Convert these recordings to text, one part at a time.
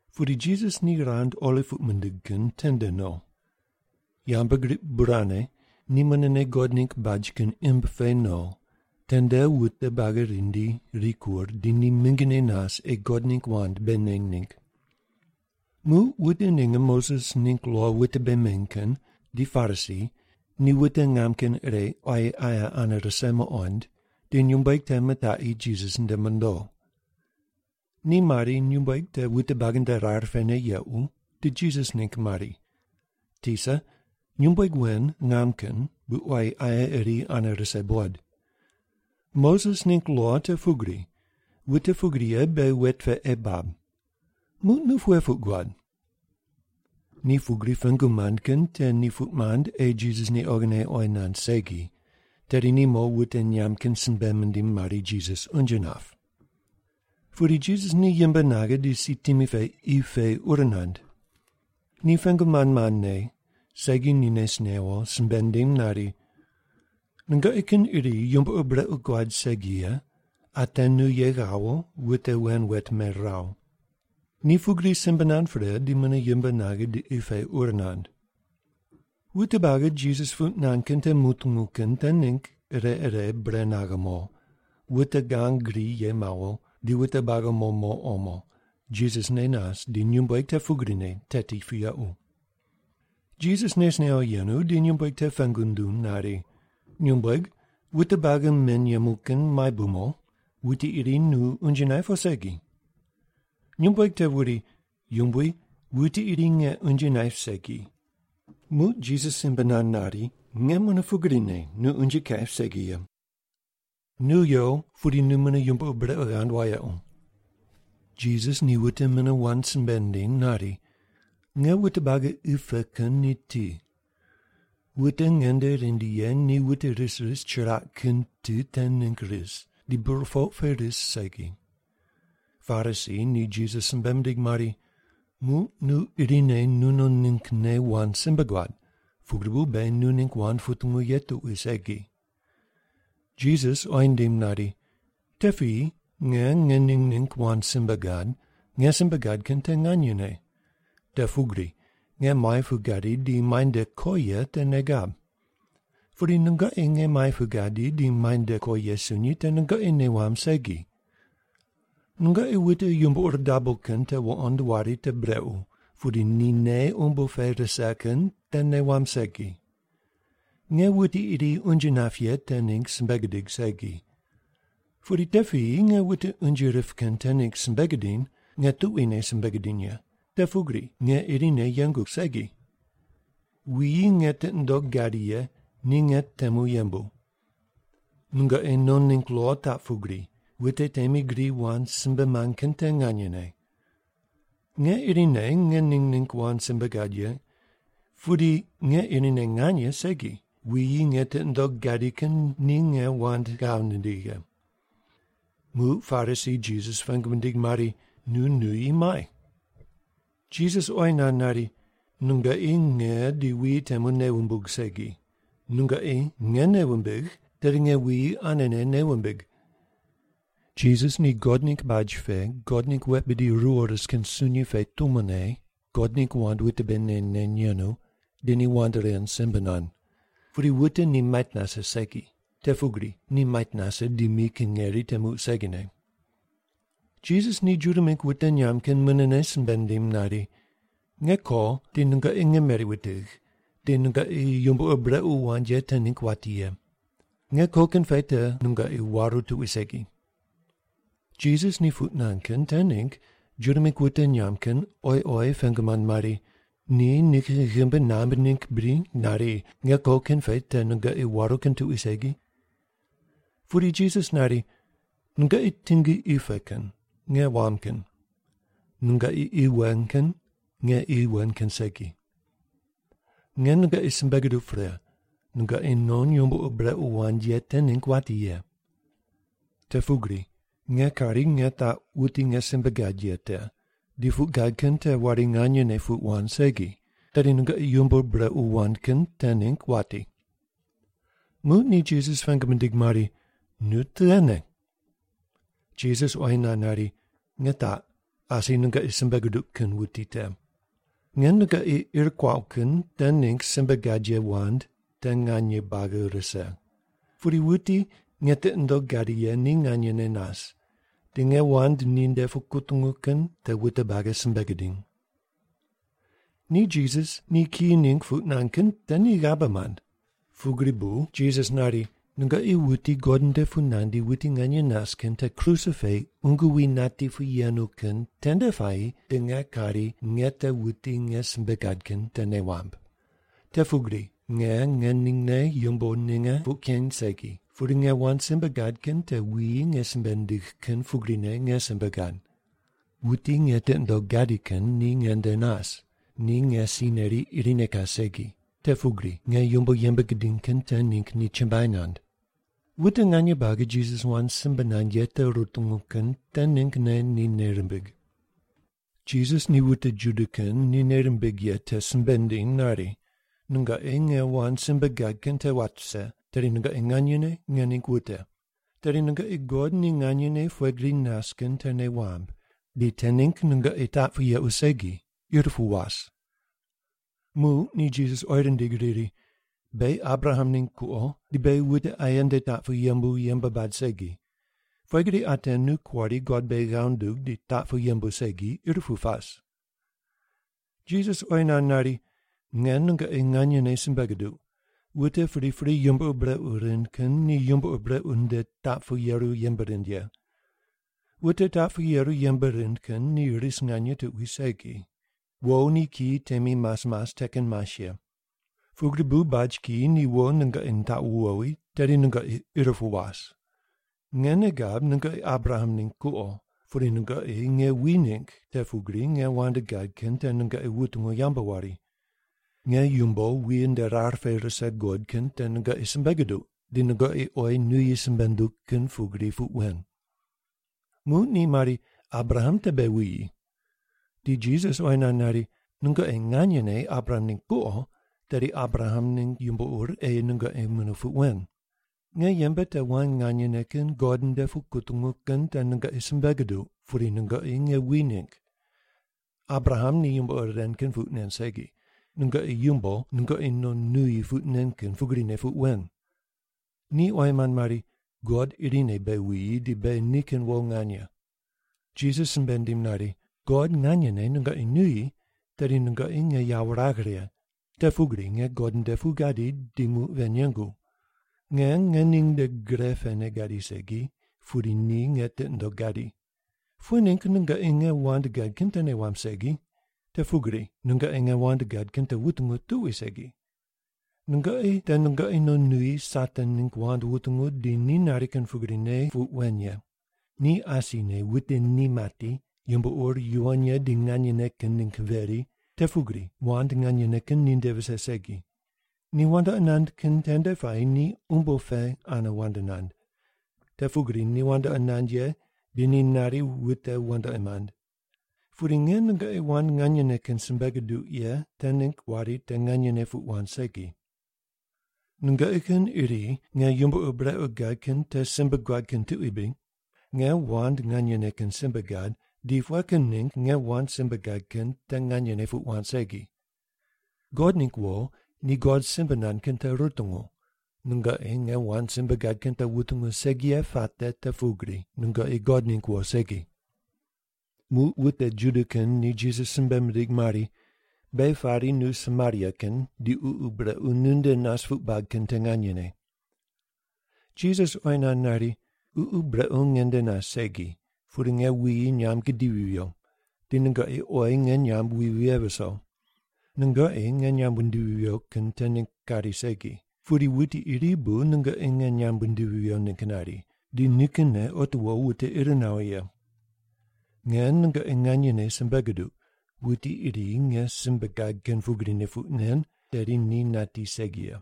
Pudi Jisas ni rand Oliv puq mindig kin tende no. Yambgriq bur ane ni munene God ningg baj kin imb pe no, tende wute buagi rindi rikur di ni mingine nas ei God ningg wand bei neny ningg. Muq wute ninge Moses ningg lo wute bei meny kin di Parisi ni wute ngam kin ire quayi aye ane rise muqond, di nyumbueg te mitaqi Jisas nde mondo. Ni mari nyumbueg te wute buagi nde rar pene yequ, di Jisas ningg mari, “Tisa, nyumbueg wen ngam kin bu quayi aye iri ane rise buqod. Moses ningg lo te pugri, wute pugri ye beghi wet pe ei bab. Muq nu pughe puq guad?” Ni pugri pengu mand kin te ni puq mand ei Jisas ni oghine oyi nand segi, tedi ni mo wute nyamb kin simbe mindim mari Jisas unje nap. Pudi Jisas ni yimb naghe di si timi pe qi pe ur nand. Ni pengu mand mandne, segi ni nes newo, simbe nindim nari, “Nungoqi kin iri yumbo ur brequ guad segi ye, ate nu ye ghawo wute wen wet meraw.” Ni pugri simbe nand pre di mune yimb naghe di qi pe ur nand. Wute buagi Jisas puq nand kin te mutungu kin te ningg ire ire bure naghe mo, wute gang gri ye mawo, di wute buagi mo mo omo, Jisas ne nas, di nyumbueg te pugrine teti pu yequ. Jisas nes newo yenu, di nyumbueg te pengu nunduw nari, “Nyumbueg, wute buagi men yemu kin muai bu mo? Wuti iri nu unje naip o segi?” Nyumbueg te wuri, “Yumbui, wuti iri nge unje naip segi.” Muq Jisas simbe nand nari, “Nge mune pugrine nu unje kaip segi ye. Nu yo, pudi nu mune yumbo ur brequ ghand wayequ.” Jisas ni wute mune wand simbe nindiny nari, “Nge wute buagi qi pe kin ni ti. Wute nge nde rindi ye ni wute ris ris chiraq kin ti te ningg ris, di burpoq pe ris segi.” Parisi ni Jisas simbe mindig mari, “Muq nu irine nunon ninggne wand simbe guad, pugri bu beghi nu ningg wand putungu ye tuqui segi.” Jisas oyi nindim nari, “Te piyi nge ngening ningg wand simbe gad, nge simbe gad kin te nganyene. Te pugri nge muai pu gadi di muai nde ko ye te nei gab. Pudi nungoqi nge muai pu gadi di muai nde ko ye sunyi te nungoqi nei wamb segi. Nungoqi wute yumbo ur dabo kin te wuqond wari te brequ, pudi ni nei umbo pe rise kin te nei wamb segi. Nge wuti iri unje nap ye te ningg simbe gidig segi. Pudi te piyi nge wute unje rip kin te ningg simbe gidiny, nge tuquine simbe gidiny ye, te pugri nge irine yengu segi. Wuyi nge tiqi nundogh gadi ye ni nge temu yembu. Nungoqi non ningg lo taq pugri, wute temi gri wand simbe mand kin te nganyene. Nge irine ngening ningg wand simbe gad ye. Pudi nge irine nganye segi, wuyi nge tiqi nundogh gadi kin ni nge wand ghav nindigh ye.” Muq Parisi Jisas pengu mindig mari, “Nu nuyi muai?” Jisas oyi nand nari, “Nungoqi nge di wuyi temu nei wumbug segi. Nungoqi nge nei wumbigh, tedi nge wuyi anene nei wumbig.” Jisas ni God ningg baj pe God ningg wet bidi ruwo ris kin sunyi pe tumone God ningg wand wute bei neny neny yenu, di ni wand ren simbe nand. Pudi wute ni mait nase segi. Te pugri ni mait nase di mi kin ngeri te muq segine. Jisas ni Juda mingg wute nyamb kin munene simbe nindim nari, “Nge ko, di nungoqi nge meri wutigh, di nungoqi yumbo ur brequ wand ye te ningg wati ye. Nge ko kin pe te nungoqi waru tuqui segi.” Jisas ni puq nand kin te ningg Juda mingg wute nyamb kin oyi oyi pengu mand mari, “Ni nikin ghimbi nambui ningg bri nari, ‘Nge ko kin pe te nungoqi waru kin tuqui segi’?” Pudi Jisas nari, “Nungoqi tingi qi pe kin, nge wam kin. Nungoqi qi wen kin, nge qi wen kin segi. Nge nungoqi simbe guduq pre, nungoqi non yumbo ur brequ wand ye te ningg wati ye. Te pugri nge kari nge taq wuti nge simbe gad ye te di puq gad kin te wari nganyene puq wand segi, tedi nungoqi yumbo ur brequ wand kin te ningg wati.” Muq ni Jisas pengu mindig mari, “Nu tughene?” Jisas oyi nand nari, “Nge taq, asi nungoqi simbe guduq kin wuti te. Nge nungoqi ir kuaqu kin te ningg simbe gad ye wand te nganye buagi rise. Pudi wuti nge tiqi nundogh gadi ye ni nganyene nas, di nge wand ninde pu kutungu kin te wute buagi simbe gidiny.” Ni Jisas ni kiyi ningg puq nand kin te ni ghabe mand. Pugri bu Jisas nari, “Nungoqi wuti God nde pu nandi wuti nganye nas kin te kruse pe qungu wi nati pu yenu kin tende puayi di nge kari nge te wuti nge simbe gad kin te nei wamb. Te pugri nge ngeningne yumbo ninge puq keny segi, pudi nge wand simbe gad kin te wuyi nge simbe nindigh kin pugrine nge simbe gad. Wuti nge tiqi nundogh gadi kin ni nge nde nas, ni nge si neri irine kas segi, te pugri nge yumbo yembe gidiny kin te ningg ni chumbuai nand.” Wute nganye buagi Jisas wand simbe nand ye te rutungu kin te ninggne ni nei rimbig. Jisas ni wute Juda kin ni nei rimbig ye te simbe nindiny nari, “Nungoqi nge wand simbe gad kin te wat vise, tedi nungoqi nganyene nge ningg wute. Tedi nungoqi God ni nganyene pughe gri nas kin te nei wamb, di te ningg nungoqi taq pu yequ segi, ir pu was.” Muq ni Jisas oyi rindig riri, “Beghi Abraham ningg kuqo, di beghi wute aye nde taq pu yembu yembe bad segi. Pughe gri ate nu kuari God beghi ghav nundug di taq pu yembu segi, ir pu pas?” Jisas oyi nand nari, “Nge nungoqi nganyene simbe guduq, wute pripri yumbo ur brequ rind kin ni yumbo ur brequ nde taq pu yeru yembe rind ye. Wute taq pu yeru yembe rind kin ni ris nganye tuqui segi. Wo ni kiyi temi mas mas te kin mas ye. Pugri bu baj kiyi ni wo nungoqi nitaqu wowi, tedi nungoqi ir pu was. Nge nei gab nungoqi Abraham ningg kuqo. Pudi nungoqi nge wi ningg, te pugri nge wand gad kin te nungoqi wutungu yambu wari. Nge yumbo wuyi nde rar pe rise guqod kin te nungoqi simbe guduq, di nungoqi oyi nuyi simbe nunduq kin pugri puq wen.” Muq ni mari, “Abraham te beghi wuyi.” Di Jisas oyi nand nari, “Nungoqi nganyene Abraham ningg kuqo, tedi Abraham ningg yumbo ur ei nungoqi mune puq wen. Nge yembe te wand nganyene kin God nde pu kutungu kin te nungoqi simbe guduq, pudi nungoqi nge wi ningg. Abraham ni yumbo ren kin puq nen segi. Nungoqi yumbo nungoqi non nuyi puq nen kin pugrine puq wen.” Ni oyi mand mari, “God irine beghi wuyi di beghi nikin wo nganye.” Jisas simbe nindim nari, “God nganyene nungoqi nuyi, tedi nungoqi nge yawo wuragh righe, te pugri nge God nde pu gadi, di muq ven yengu. Nge ngening nde gre pene gadi segi, pudi ni nge tiqi nundogh gadi. Pughe ningg nungoqi nge wand gad kin te nei wamb segi? Te pugri nungoqi nge wand gad kin te wutungu tuqui segi. Nungoqi te nungoqi non nuyi Satan ningg wand wutungu di ni nari kin pugrine puq wen ye. Ni asine wute ni mati, yumbo ur yuwon ye di nganyene kin ningg veri, te pugri wand nganyene kin ninde vise segi. Ni wandoqi nand kin tende puayi ni umbo pe ane wand nand, te pugri ni wandoqi nand ye, di ni nari wute wandoqi mand. Pudi nge nungoqi wand nganyene kin simbe guduq ye te ningg wari te nganyene puq wand segi! Nungoqi kin iri nge yumbo ur brequ gad kin te simbe guad kin tuqui bri? Nge wand nganyene kin simbe gad di pughe kin ningg nge wand simbe gad kin te nganyene puq wand segi? God ningg wo ni God simbe nand kin te rutungu. Nungoqi nge wand simbe gad kin te wutungu segi ye puate te pugri nungoqi God ningg wo segi.” Muq wute Juda kin ni Jisas simbe mindig mari, “Beghi pari nu Samaria kin di ququ brequ nu nde nas puq bad kin te nganyene.” Jisas oyi nand nari, “Ququ brequ nge nde nas segi, pudi nge wuyi nyamb gidivi viyo, di nungoqi oyi nge nyamb wi vighe viso. Nungoqi nge nyamb wundivi viyo kin te ningg kari segi, pudi wuti iri bu nungoqi nge nyamb wundivi viyo ningg nari, di nikinne otiwo wute ir nawo ye. Nge nungoqi nganyene simbe guduq wuti iri nge simbe gad kin pugrine puq nen, tedi ni nati segi ye.”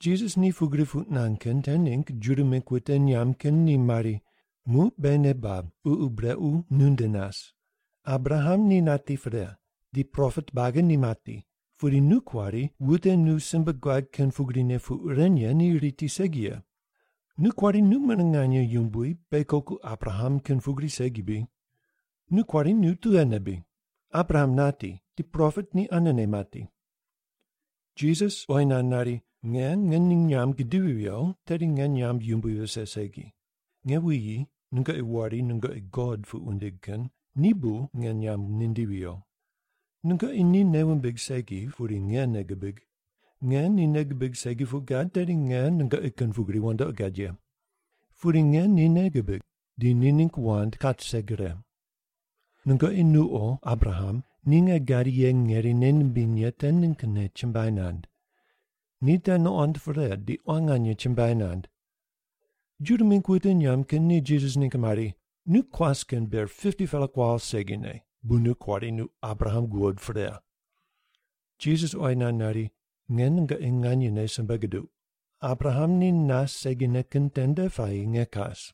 Jisas ni pugri puq nand kin te ningg Juda mingg wute nyamb kin ni mari, “Muq beghi nei bab ququ brequ nu nde nas! Abraham ni nati pre, di propet buagi ni mati, pudi nu kuari wute nu simbe guad kin pugrine puq ren ye ni riti segi ye. Nu kuari nu mune nganye yumbui, beghi koku Abraham kin pugri segi bri? Nu kuari nu tughene bri? Abraham nati, di propet ni anene mati.” Jisas oyi nand nari, “Nge ngening nyamb gidivi viyo, tedi nge nyamb yumbui vise segi. Nge wuyi nungoqi wari nungoqi God puq wundig kin ni bu nge nyamb nindivi viyo. Nungoqi ni nei wumbig segi, pudi nge nei gibig. Nge ni nei gibig segi puq gad, tedi nge nungoqi kin pugri wandoqi gad ye. Pudi nge ni nei gibig, di ni ningg wand kat rise gre. Nungoqi nuqo Abraham ni nge gadi ye ngeri nei nimbiny ye te ninggne chumbuai nand. Ni te nuqond pre di quan nganye chumbuai nand.” Juda mingg wute nyamb kin ni Jisas ningg mari, “Nu kuas kin ber 50-pela kuawo segine bu nu kuari nu Abraham guqoid pre!” Jisas oyi nand nari, “Nge nungoqi nganyene simbe guduq, Abraham ni nas segine kin tende puayi nge kas!”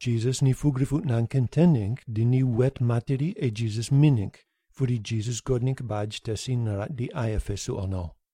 Jisas ni pugri puq nand kin te ningg di ni wet materi ei Jisas mi ningg, pudi Jisas God ningg baj te si niraq di aye pe suqo no.